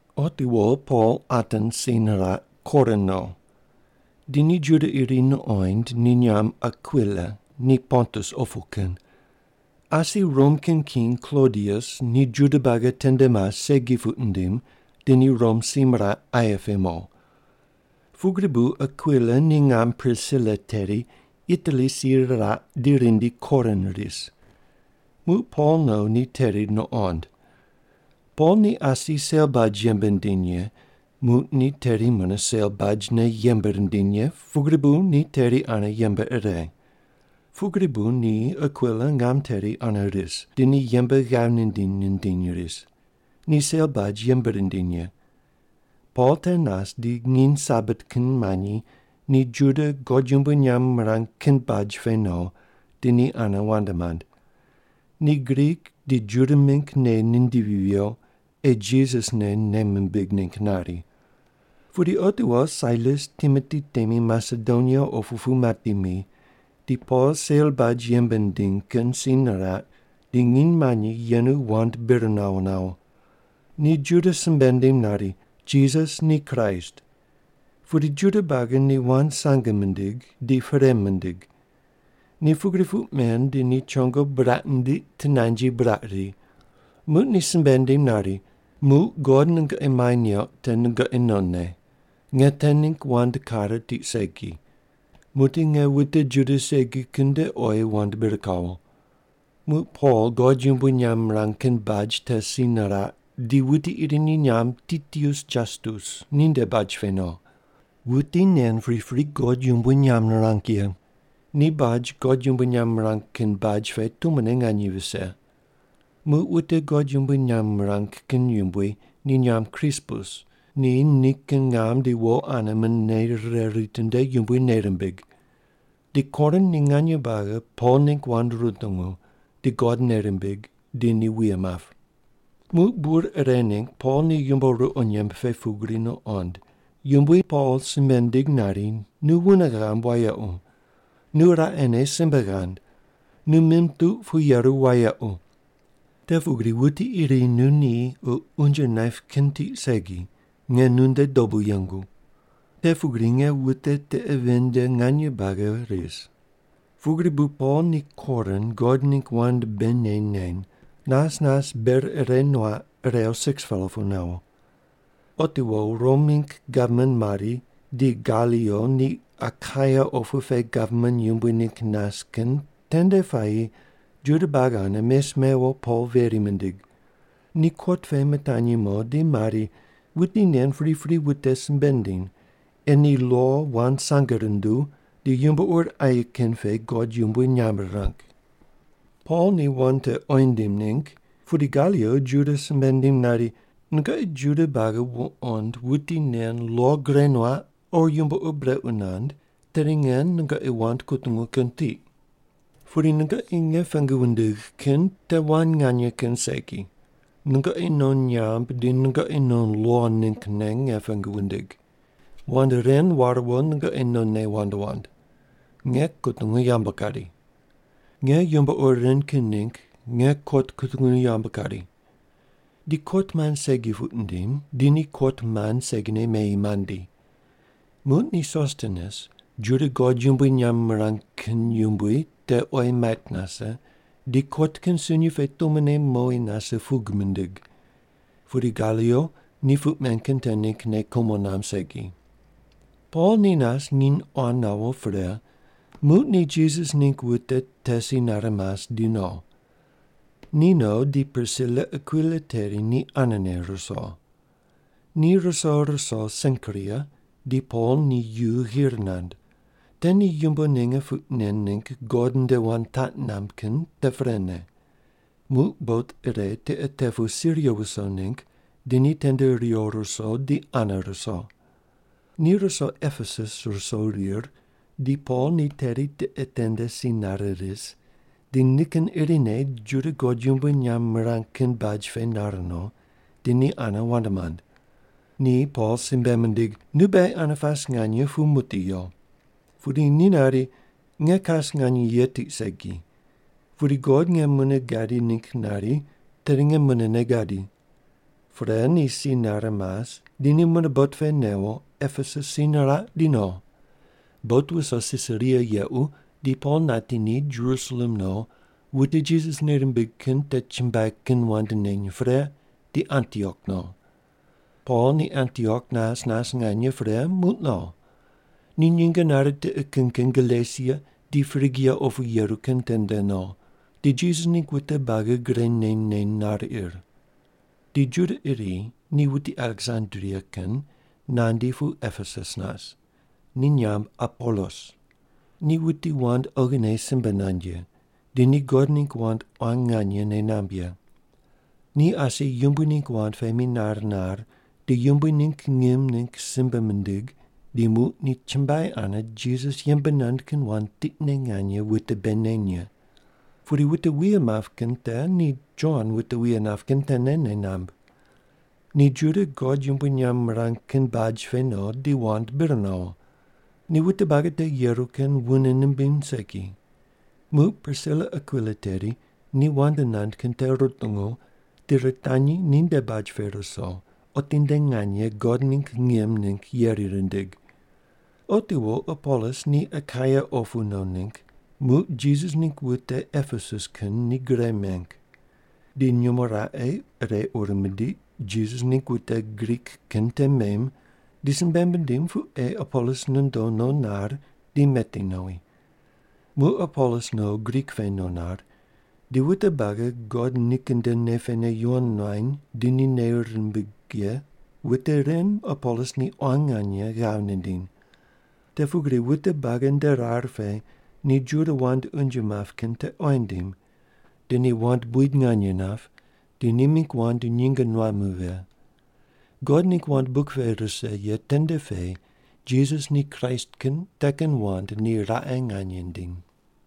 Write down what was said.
Otiwo Pol Atens si niraq, Korin no. Di ni Juda iri nuqoind, ni nyamb Akwila, ni Pontus opu kin. Asi Rom kin king Klodius, ni Juda buagi tende mas segi puq nindim di ni Rom si miraq aye pe mo. Pugri bu Akwila ni ngam Prisila teri Itali si riraq di rindi Korin ris. Muq Pol no ni teri nuqond. Pol ni asi sel baj yembe nindiny ye, muq ni teri mune sel bajne yembe rindiny ye pugri bu ni teri ane yembe ire. Pugri bu ni Akwila ngam teri ane ris, di ni yembe ghav nindiny nindiny ris. Ni sel baj yembe rindiny ye. Pol te nas di nginy Sabat kin manyi ni Juda God yumbui nyamb mirang kin baj pe no, di ni ane wand mand. Ni Grik di Juda mingg nei nindivi viyo, ei Jisas ne nei mimbig ningg nari. Pudi otiwo Sailas Timoti temi Masedonia opu pu mati mi, di Pol sel baj yembe nindiny kin si niraq di nginy manyi yenu wand bir nawo nawo. Ni Juda simbe nindim nari, “Jisas ni Kraist.” Pudi Juda buagi ni wand sange mindig, di perei mindig. Ni pugri puq men di ni chongo buraq nindiq tinanji buraq ri. Muq ni simbe nindim nari, “Muq God nungoqi mai neuq te nungoqi nonne. Nge te ningg wand kare tiq segi. Muqdi nge wute Juda segi kin nde oyi wand bir kawo.” Muq Pol God yumbui nyamb mirang kin baj te si niraq, di wuti iri ni nyamb Titius Jastus ninde baj pe no. Wuti nen pripri God yumbui nyamb nirang ye. Ni baj God yumbui nyamb mirang kin baj pe tumone nganye vise. Muq wute God yumbui nyamb mirang kin yumbui, ni nyamb Krispus, ni nikin ngam di wo ane mune nei rire ritinde Yumbui nei rimbig. Di Korin ni nganye buagi Pol ningg wand rutungu, di God nei rimbig, di ni wuye map. Muq bur ire ningg Pol ni yumbo ruqo nyemb pe pugri nuqond, Yumbui Pol simbe nindig nari, “Nu wune ghamb wayequ. Nu raqene simbe ghand. Nu mim tuq pu yeru wayequ. Te pugri wuti iri nu ni o unje naip kin tiq segi, nge nunde dobu yengu. Te pugri nge wute tiqe ven nde nganye buagi ris.” Pugri bu Pol ni Korin God ningg wand bei neny neny, nas nas ber ire nuaq irew 6-pela pu nawo. Otiwo Rom mingg gavman mari di Galio ni Akaia opu pe gavman yumbui ningg nas kin tende puayi Juda buagi ane mes mewo Pol veri mindig. Ni kot pe mitanyi mo di mari, “Wuti nen pripri wute simbe nindiny ei ni lo wand sange runduw di yumbo ur aye kin pe God yumbui nyamb rirang.” Pol ni wand te oyi nindim ningg, pudi Galio Juda simbe nindim nari, “Nungoqi Juda buagi wuqond wuti nen lo gure nuaq o yumbo ur brequ nand, tedi nge nungoqi wand kutungu kin tiq. Pudi nungoqi nge pengu wundigh kin te wand nganye kin segi, nungoqi non nyamb di nungoqi non lo ninggne nge pengu wundigh. Wand ren ware wo nungoqi nonne wand wand. Nge kutungu yambu kari. Nge yumbo ur ren kin ningg nge kot kutungu yambu kari.” Di kot mand segi puq nindim, di ni kot mand segine meyi mandi. Muq ni Sostenes Juda God yumbui nyamb mirang kin yumbui te oyi mait nase, di kot kin sunyi pe tumone mowi nase pug mindig. Pudi Galio ni puq men kin te ningg nei kumo namb segi. Pol ni nas nginy quan nawo pre, muq ni Jisas ningg wute te si nare mas di no. Ni no di Prisila Akwila teri ni anene ruso. Ni ruso ruso Senkria, di Pol ni yu ghir nand. Te ni yumbo ninge puq nen ningg God nde wand taq namb kin te prene. Muq bot ire tiqe te pu Siria wuso ningg di ni tende riwo ruso, di ane ruso. Ni ruso Epesus ruso rir, di Pol ni teri tiqe tende si nare ris, di nikin irine Juda God yumbui nyamb mirang kin baj pe nar no, di ni ane wand mand. Ni Pol simbe mindig, “Nu beghi ane pas nganye pu muqdi yo.” Pudi ni nari, “Nge kas nganye ye tiq segi. Pudi God nge mune gadi ningg nari tedi nge munene gadi.” Pre ni si nare mas di ni mune bot pe newo Epesus si niraq di no. Bot wuso Sisaria yequ di Pol nati ni, Jerusalem no wute Jisas nei rimbig kin te chumbuai kin wand neny pre di Antiok no. Pol ni Antiok nas nas nganye pre muq no. Ni nyinge nare tiqe kin kin Galesia di Prigia opu yeru kin tende no, di Jisas ningg wute buagi gre neny neny nar ir. Di Juda iri ni wuti Aleksandria kin nandi pu Epesus nas. Ni nyamb Apolos. Ni wuti wand oghine simbe nand ye, di ni God ningg wand quan nganye nei namb ye. Ni asi Yumbui ningg wand pe minar nar di Yumbui ningg ngim ningg simbe mindig di muq ni chumbuai ane Jisas yembe nand kin wand tiqne nganye wute bei neny ye. Pudi wute wuye map kin te ni Jon wute wuye nap kin tene nei namb. Ni Juda God yumbui nyamb mirang kin baj pe no di wand bir nawo. Ni wute buagi te yeru kin wune nimbiny segi. Muq Prisila Akwila teri ni wand nand kin te rutungu di ritanyi ninde baj pe ruso otinde nganye God ningg ngim ningg yeri rindig. Otiwo Apolos ni Akaia opu no ningg, muq Jisas ningg wute Epesus kin ni gre meng. Di nyumo raqe ire ur mindiq Jisas ningg wute Grik kin te mem, di simbe mindim pu ei Apolos nondo no nar di meti nowi. Muq Apolos no Grik pe no nar, di wute buagi God nikin nde nei pene yuwon nuany di ni nei rimbig ye wute ren Apolos ni quan nganye ghav nindiny. Te pugri wute buagi nde rar pe ni Juda wand unje map kin te oyi nindim, di ni wand buid nganye nap di ni mingg wand nyinge nuam vighe. God ningg wand buk pe rise ye tende pe Jisas ni Kraist kin te kin wand ni raqe nganye nindim.